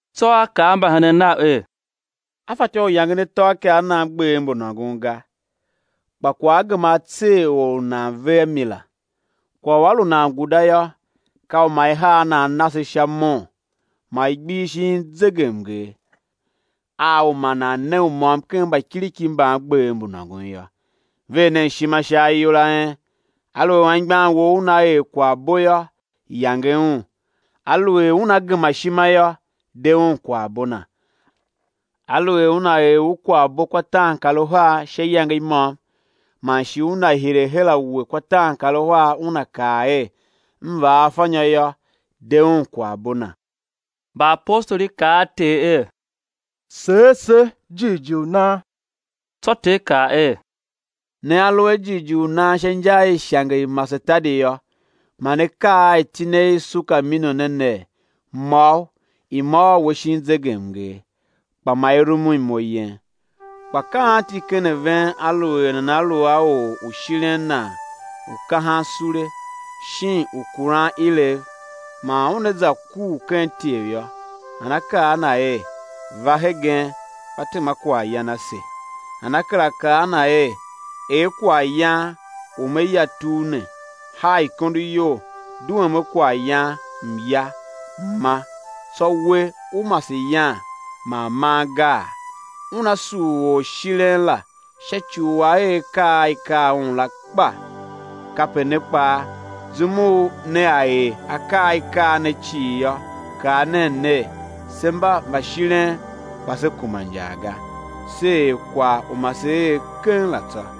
Tsô A kaa a mbahenen Nav er: Á fatyô u yangen atôakaa a nan gbev mbu nôngon ga; kpa kwagh á gema á tser or u nan ve a mi la! Kwagh u a lu nan guda yô, ka u ma i har nan nase sha mon, ma i gbihi shin zegemnger, a u ma nan ne u môm ken mbakiriki mban gbev mbu nôngon yô. Ver nen ishima sha ayol a en. Aluer anmgbian wou una er kwaghbo yô, yange un; aluer una gema ishima yô, de un kwaghbo na. Aluer una er u kwaghbo kwa taankaruhar sha iyange i môm, man shi una hire her a we kwa taankaruhar, una kaa er: M vaa afanyô yô, de un kwaghbo na. Mbaapostoli kaa a Ter er: Seer se jighjigh u nan! Tsô Ter kaa er: Nea lu a jighjigh u nan sha inja i ishange i masetadi yô, ma ne kaa a itine i sukamino ne ner: Môgh, i môôr we shin zegemnger! Kpa ma i rumun imo yen. Kpa ka anti ken a ven aluer nana lu a or u shiren nan u kahan sule, shin u kuran ilev, man una za kur ken ityev yô, nana kaa a na er: Va hegen, va tema kwaghyan ase? Nana kera kaa a na er: Er kwaghyan u me ya tugh ne, haa ikondo iyol, duem a kwaghyan, m̱ ya, m̱ ma, tsô we ú mase yan man man, gaa? Una sugh orshiren la sha ci u a er akaa a i kaa un la kpa? Kape ne kpaa, zum nea er akaa a i kaa ne cii yô, kaa nen ner: Se mba mbashiren kpa se kuma injar ga, se er kwagh u ma se er keng la tsô.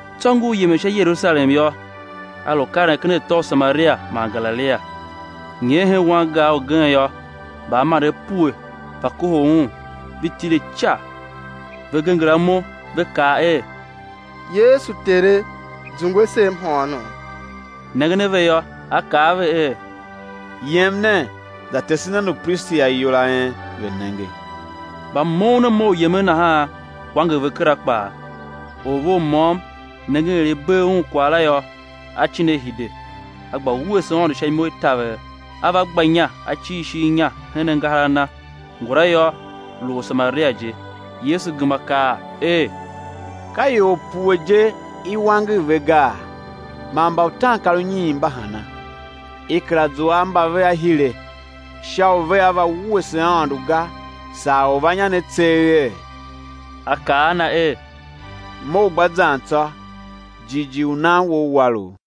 Tsô ngur yemen sha Yerusalem yô, A lu karen ken atô u Samaria man Galilia. Nyer hen wangar ugen yô, mbaamandev pue va kohol Un; ve tile ica. Ve genger imo ve kaa er: Yesu, Tere, zungwe se mhôônom! Nengen a ve yô, A kaa a ve er: Yem nen, za tese nen upristi ayol a en, ve̱ nenge. Mba moughon a mough u yemen nahan, wanger ve kera kpaa. Or ve u môm nengen er i bee un kwagh la yô, a cin a hide, a gba wuese Aôndo sha imo i taver; a va gba inya a cir ishigh inya hen angahar a Na; ngula yô, lu or u Samaria je. Yesu gema kaa er: Ka ior pue je i wanger ve gaa? Man mba utaankarunyiin mba hana? I kera zua a mba vea hire sha u vea va wuese Aôndo ga, saa orvannya ne tseeghe? A kaa a na er: Mough, gba zan tsô; jighjigh u nan wou war u.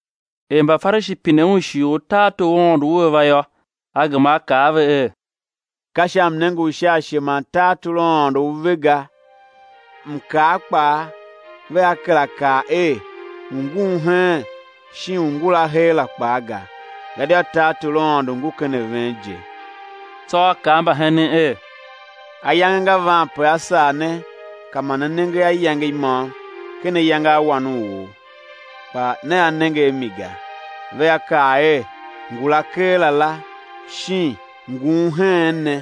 Er Mbafarishi pine Un shighe u tartor u Aôndo ua va yô, A gema A kaa a ve er: Ka sha mnenge u sha ashe man tartor u Aôndo u ve ga. Mkaa kpaa vea kera kaa er ungun heen shin ungula heera kpaa ga; gadia tartor u Aôndo ngu ken a ven je. Tsô A kaa a mbahenen er: Ayange nga van pe á sar ne ka ma ne nenge a iyange imôm ken ayange a Wan u or, kpa nea nenge a mi ga. Vea kaa er: Ngula keela la! Shin: Ngun heen ne!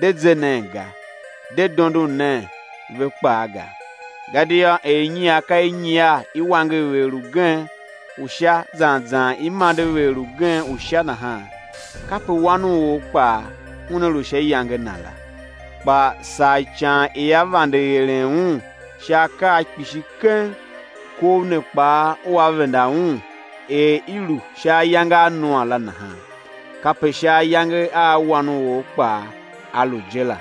De ze nen ga, de dondon nen ve kpaa ga. Gadia er inyiar ka i nyiar i wanger vegher ugen u Sha zan zan i mande vegher ugen u Sha nahan, kape Wan u or kpaa Una lu sha iyange Na la. Kpa saa ican ia vande eren Un sha akaa kpishi keng, kov ne kpaa ua venda Un. Er i lu sha ayange a Noa la nahan, kape sha ayange a Wan u or kpaa á lu je la.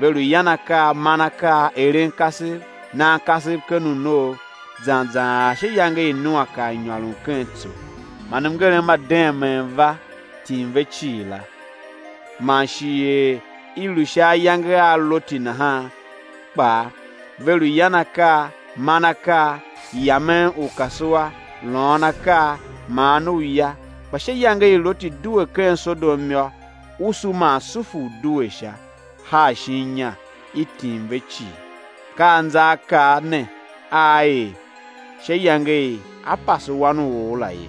Ve lu yan akaa, man akaa eren kasev, nan kasev ken unoo, zan zan ar sha iyange i Noa kar nyôron ken tso, man mngerem ma deemee va, tim ve cii la. Man shi er i lu sha ayange a Loti nahan kpaa; ve lu yan akaa, man akaa, yamen ukasua, lôôn akaa, maan uya. Kpa sha iyange i Loti due ken Sodom yô, usu man sulfur due sha, haa shin inya, i tim ve cii. Ka anzaakaa ne aa er sha iyange i á pase Wan u or la ye.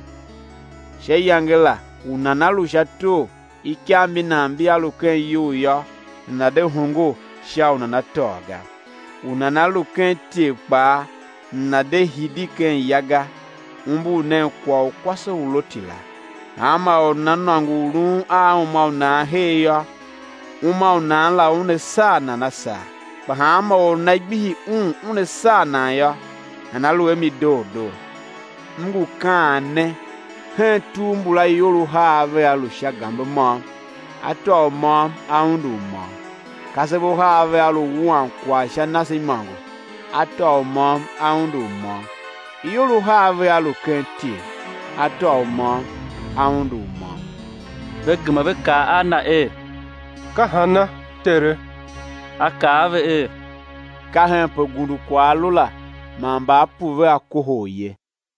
Sha iyange la u nana lu sha tor, ikav mbi nan mbia lu ken iyou yô, nana̱ de hongo sha u nana tôô ga; u nana lu ken ityev kpaa, nana̱ de hidi ken ya ga. Umbur nen kwagh u kwase u Loti la. Hanma or u nana nôngo u lun a uma u nan her yô, uma u nan la una saa nan a saa; kpa hanma or u nana gbihi un una saa nan yô, nana lu a mi doo doo. M ngu kaan ne, hen tugh mbula ior uhar vea lu sha gambe môm; á tôô u môm, á undu u môm. Kasev uhar vea lu wuan kwagh sha nase imôngo; á tôô u môm a undu u môm. [ Ior uhar vea lu ken ityev; á tôô u môm man á undu u môm.] Ve gema ve kaa a Na er: Ka hana, Tere? A kaa a ve er: Ka henpe gundukwagh a lu la, man mbaapu vea kohol ye.